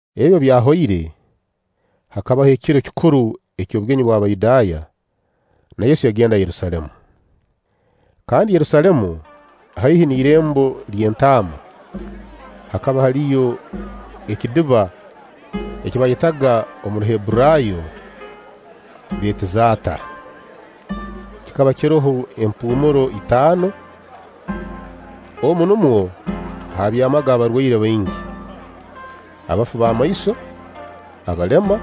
Ebi obu byahoire, hakabaho ekiro kikuru eky'obugenyi bw'Abayudaaya, na Yesu yagenda Yerusaalemu. Kandi Yerusaalemu, haihi n'Irembo ly'Entaama, hakaba haliyo ekidiba eki baayetaga omu Ruhebburaayo: Beetizata. Kikaba kiroho empuumuro itaano. Omu numwo haabyamaga abarwaire baingi: abafu b'amaiso, abalema,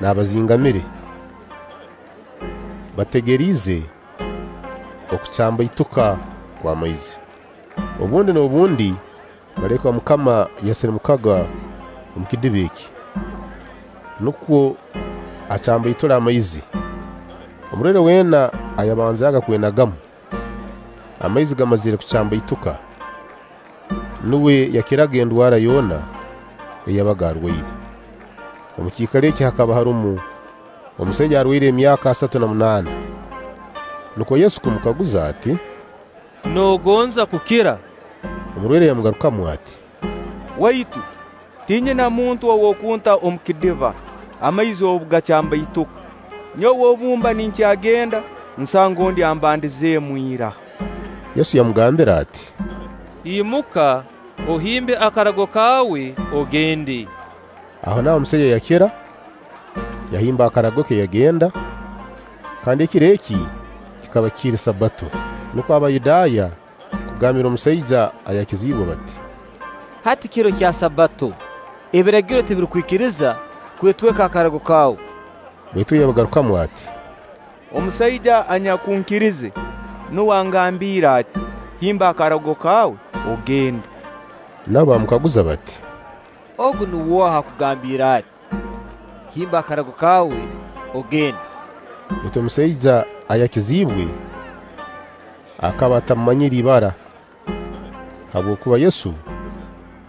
n'abazingamire, (bategeriize okucambaituka kw'amaizi. Obundi n'obundi malaika wa MUKAMA yasirimukaga omu kidiba eki, nukwo acambaitule amaizi. Omurwaire weena ayabanzaaga kwenagamu, amaizi gamazire kucambaituka, nuwe yakiraga endwara yoona ei yabaga arwaire.) Omu kiikaro eki hakaba harumu omusaija arwaliire emyaka asatu na munaana. Nukwo Yesu kumukaguza ati: “Noogonza kukira?” Omurwaire yamugarukamu ati: “Waitu tinyina muntu ow'okunta omu kidiba, amaizi obu gacambaituka. Nyowe obu mba ninkyagenda, nsanga ondi ambandizeemu ira.” Yesu yamugambira ati: “Imuka, ohimbe akarago kaawe, ogende.” Ahonaaho omusaija yakira, yahimba akarago ke, yagenda. Kandi ekiro eki kikaba kiri Sabbato. Nukwo Abayudaaya kugambira omusaija ayakiziibwe bati: “Hati kiro kya Sabbato, Ebiragiro tibirukukwikiriza kwetweka karago kaawe.” Baitu uwe yabagarukamu ati: “Omusaija anyakunkirize nuwe angambiire ati: ‘Himba akarago kaawe, ogende.’” Nabo baamukaguza bati: “Ogu nuwe oha akugambiire ati: ‘Himba akarago kaawe, ogende’?” Baitu omusaija ayakiziibwe akaba atamumanyire ibara, habwokuba Yesu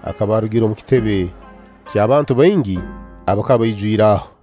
akaba arugire omu kitebe kyabantu baingi abakaba baijwire aho.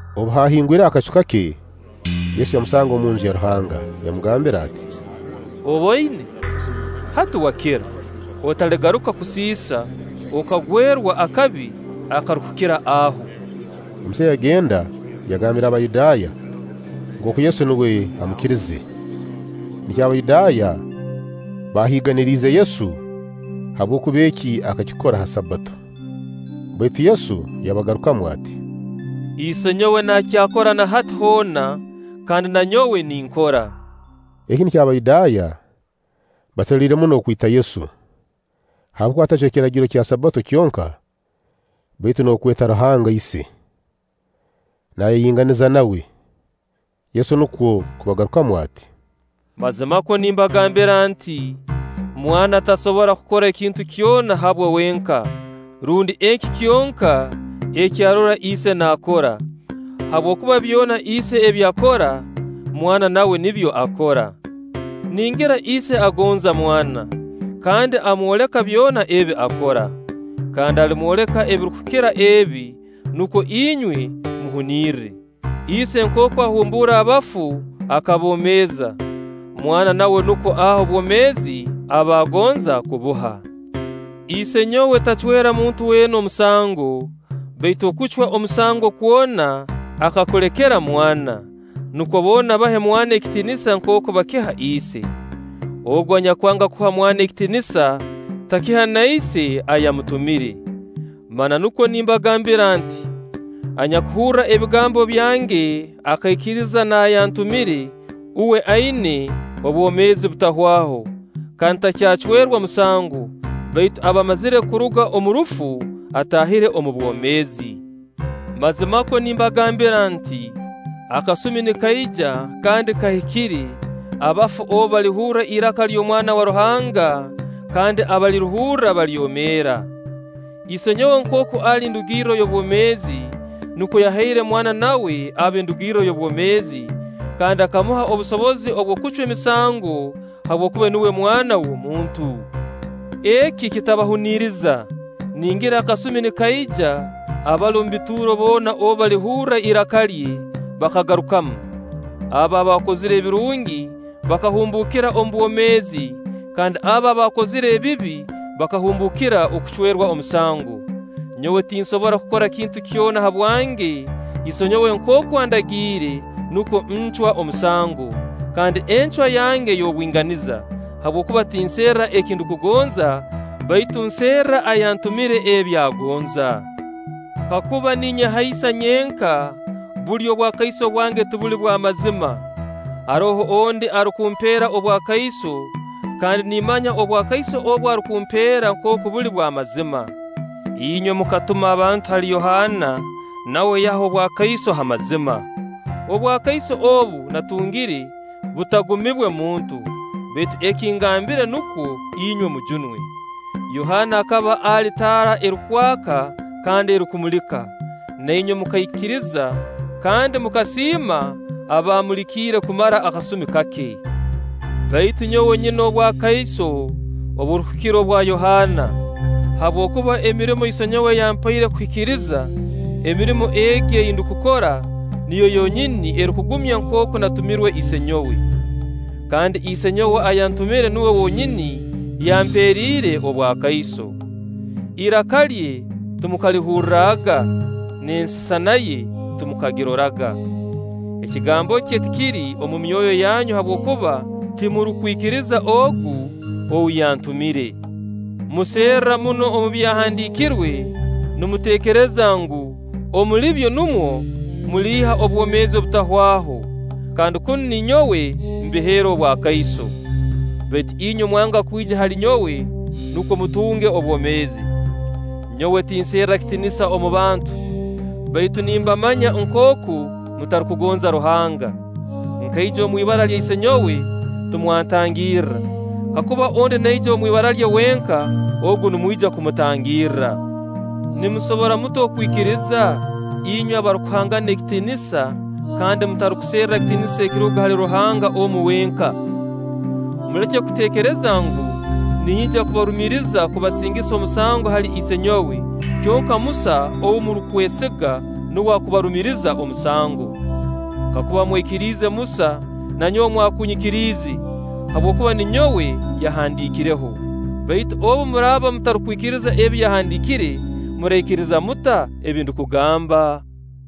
Obu hahingwireho akacu kake, Yesu yamusanga omunju ya Ruhanga, yamugambira ati: “Oboine, hati wakira! Otaligaruka kusiisa, okagwerwa akabi akarukukira aho.” Omusaija yagenda, yagambira Abayudaaya nkooku Yesu nuwe amukirize. Nikyo Abayudaaya bahiiganiriize Yesu, habwokuba eki akakikora ha Sabbato. Baitu Yesu yabagarukamu ati: “Isenyowe nakyakora na hati hoona, kandi na nyowe ninkora.” Eki nikyo Abayudaaya baaseruliire muno okwita Yesu, habwokuba atacwe kiragiro kya Sabbato kyonka, baitu n'okweta Ruhanga Ise, naayeyinganiza nawe. Yesu nukwo kubagarukamu ati: “Mazimakwo nimbagambira nti: Mwana tasobora kukora ekintu kyona habwe wenka, rundi eki kyonka eki arora Ise naakora; habwokuba byona Ise ebi akora, Mwana nawe nibyo akora. Ningira Ise agonza Mwana, kandi amwoleka byona ebi akora; kandi alimwoleka ebirukukira ebi, nukwo inywe muhunirre. Ise nkooku ahumbuura abafu akaboomeeza, Mwana nawe nukwo aha obwomeezi abaagonza kubuha. Isenyowe tacwera muntu weena omusango, baitu okucwa omusango kwona akakulekera Mwana, nukwo boona bahe Mwana ekitiinisa nkooku bakiha Ise. Ogu anyakwanga kuha Mwana ekitiinisa, takiha na Ise ayamutumire. Mananukwo nimbagambira nti: Anyakuhurra ebigambo byange akaikiriza n'ayantumire, uwe aina obwomeezi butahwaho; kandi takyacwerwa musango; baitu aba amazire kuruga omu rufu, ataahire omu bwomeezi. “Mazimakwo nimbagambira nti: Akasumi nikaija, kandi kahikire, abafu obu balihurra iraka ly'Omwana wa Ruhanga, kandi abalirihurra balyomeera. Isenyowe nkooku ali ndugirro y'obwomeezi, nukwo yahaire Mwana nawe abe ndugirro y'obwomeezi; kandi akamuha obusobozi obw'okucwa emisango, habwokuba nuwe Mwana w'omuntu. Eki kitabahuniriza, ningira akasumi nikaija, abali omu bituuro boona obu balihurra iraka lye, bakarugamu. Abo abaakozire ebirungi bakahumbuukira obwomeezi; kandi abo abaakozire ebibi bakahumbuukira okucwerwa omusango. “Nyowe tinsobora kukora kintu kyona habwange, Isenyowe nkooku andagiire, nukwo ncwa omusango; kandi encwa yange y'obwinganiza, habwokuba tinserra eki ndukugonza, baitu nserra ayantumire ebi agonza. Kakuba ninyehaisa nyenka, buli obwakaiso bwange tibuli bw'amazima. Haroho ondi arukumpeera obwakaiso, kandi nimmanya obwakaiso obu arukumpeera nkooku buli bw'amazima. Inywe mukatuma abantu hali Yohaana, na uwe yaha obwakaiso ha mazima. Obwakaiso obu naatungire butagumibwe muntu; baitu eki nkigambire nukwo inywe mujunwe. Yohaana akaba ali taara erukwaka kandi erukumulika, na inywe mukaikiriza kandi mukasiima abamulikire kumara akasumi kake. Baitu nyowe nyina obwakaiso oburukukira obwa Yohaana; habwokuba emirimo Isenyowe yampaire kuhikiriza, emirimo egi ei ndukukora, niyo yonyini erukungumya nkooku naatumirwe Isenyowe. Kandi Isenyowe ayantumire nuwe wonyini yamperiire obwakaiso. Iraka lye timukalihurraga, n'ensisana ye timukagiroraga; ekigambo kye tikiri omu myoyo yanyu habwokuba timurukwikiriza ogu ou yatumire. “Muserra muno omu Byahandiikirwe, nimuteekereza ngu, omuli byo numwo muliiha obwomeezi obutahwaho; kandi kunu ninyowe mbiheera obwakaiso; baitu inywe mwanga kwija hali nyowe, nukwo mutunge obwomeezi. Nyowe tinserra kitiinisa omu bantu; baitu nimbamanya nkooku mutarukugonza Ruhanga. Nkaija omwibara lya Isenyowe, timwantangirra; kakuba ondi naija omu ibara lye wenka, ogu nimwija kumutangirra. Nimusobora muta okwikiriza, inywe abarukuhangana ekitiinisa kandi mutarukuserra kitiinisa ekiruga hali Ruhanga omu wenka? Muleke kuteekereza ngu, ninyija kubarumiriza kubasingisa omusango hali Isenyowe; kyonka Musa ou murukwesiga, nuwe akubarumiriza omusango. Kakuba mwaikiriize Musa, na nyowe mwakunyikiriize, habwokuba ninyowe yahandiikireho; baitu obu muraaba mutarukwikiriza ebi yahandiikire, muraikiriza muta ebi ndukugamba?”